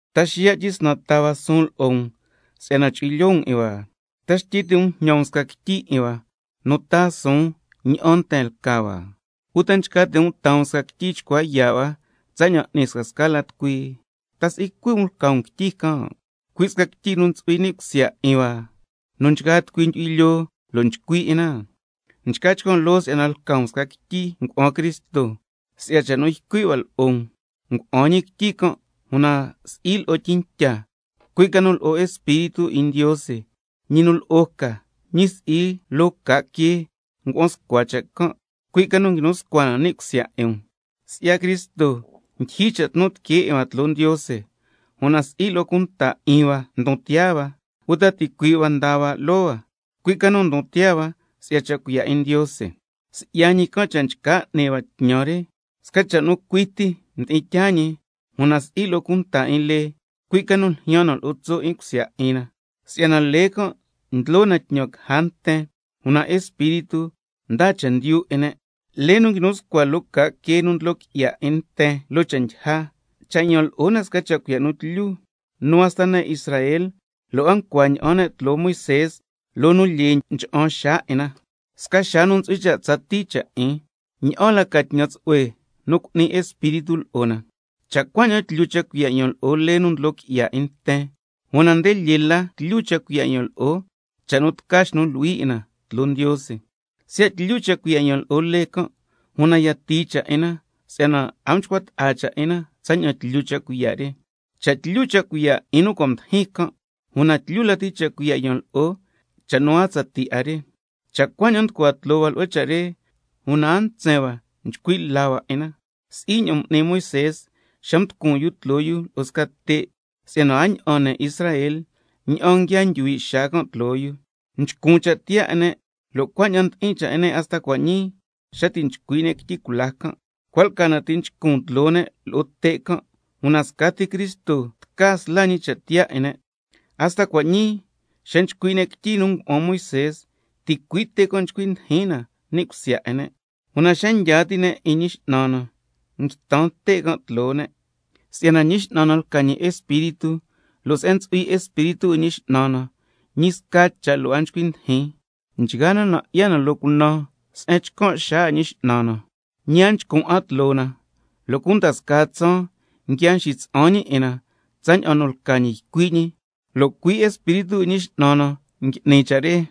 ¿Ta xiya' tyisnan taa hua suun lo'o um si'yana chu'hui lyoo um 'in hua? ¿Ta xtyi ti' um jñan um sca quityi 'in hua nu taa suun ña'an nten lca hua, uta nchca ti' um taa um sca quityi chcua yaa' hua, tsaña'an n'ni scasca la tucui? ¿Ta si'i cui' um lca um quityi can', cui' sca quityi nu cua' ntsu'hui ni' cusya 'in hua, nu nchgaa tucui ndyu'hui lyoo lo' nchcui' 'in na? Nchca chcan' loo si'yana lca um sca quityi ngua'an Cristo si'ya cha' nu ycui' hua lo'o um, ngua'an ñi quityi can' una si'i lo'o tyintya, cui' ca nu lo'o Espíritu 'in Ndiose, ñi nu lo'o ca, ñi si'i loo ca' quee ngua'an scua cha' can', cui' ca nu nguinu scua na ni' cusya 'in um. Si'ya Cristo ndyijyi cha' tnu tiquee 'in hua tloo Ndiose, una si'i lo'o cunta 'in hua ndon tiyaa hua, uta ticuii' hua nda hua loo hua, cui' ca nu ndon tiyaa hua si'ya cha' cuiya' 'in Ndiose. Si'ya ñi can' cha' nchca n'ni hua tñan re, sca cha' nu cui ti mdi'in tyaa ñi, una si'i lo'o cunta 'in lee, cui' ca nu ljyaan na lo'o tso' 'in cusya 'in na, si'yana lee can' ndlo na tñan caja nten, una Espíritu ndaa chendyu 'in ne'. Lee nu nguinu scua loo ca' quee nu ndlo qui'ya 'in nten loo cha' ndyija, cha' yan lo'o na sca cha' cuiya' nu tlyu, nu hasta ne' Israel lo' a ncua ña'an ne' tloo Moisé, loo nu lyee ncha'an xaa 'in na, sca xaa nu ntsu'hui cha' tsatii cha' 'in. ¿Ña'an la ca tñan tsu'hue nu cu'ni Espíritu lo'o na? Cha' cuaña'an tlyu cha' cuiya' yan lo'o lee nu ndlo qui'ya 'in nten, una nde lyee lati tlyu cha' cuiya' yan lo'o cha' nu tca xnu luhui 'in na tloo Ndiose. Siya' tlyu cha' cuiya' yan lo'o lee can', una yatii cha' 'in na, si'yana a mchcua ta'a cha' 'in na tsaña'an tlyu cha' cuiya' re. Cha' tlyu cha' cuiya' 'in nu cua' mdijin can', una tlyu lati cha' cuiya' yan lo'o cha' nu a tsatii 'a re. Cha' cuaña'an nducua tloo hua lo'o cha' re, una a ntsen hua chcui' la hua cha' re, si'i ña'an m'ni Moisé xa mducun yu tloo yu lo'o sca te' si'yana a ña'an ne' Israel ña'an nguia ndyuhui' xaa can' tloo yu, si'yana mchcun cha' tiyaa 'in ne', lo' cuaña'an ndi'in cha' 'in nten hasta cua' ñii xa nchcui' ne' quityi cula can', cua' lca na ti' nchcun tloo ne' lo'o te' can', una scati Cristo tca sla ñi cha' tiyaa 'in ne'. Hasta cua' ñii xa nchcui' ne' quityi nu ngua'an Moisé, ticui' te' can' nchcui ndijin na ni' cusya 'in ne'. —Una xa ndyaa ti' nten 'in Ñi X'nan na, nguitan te' can' tloo ne'—. Si'yana Ñi X'nan na lca ñi Espíritu, lo' se'en ntsu'hui Espíritu 'in Ñi X'nan na, ñi sca cha' lo' a nchcui ndijin. Nchgaa na nan' 'ya na loo cunan se'en nchcan' xaa 'in Ñi X'nan na, ñi a nchcun 'a tloo na, lo' cunda scaa tsaan nguia nxitsa'an ñi 'in na tsaña'an nu lca ñi ycui' ñi, lo' cui' Espíritu 'in Ñi X'nan na ngui'ni ñi cha' re.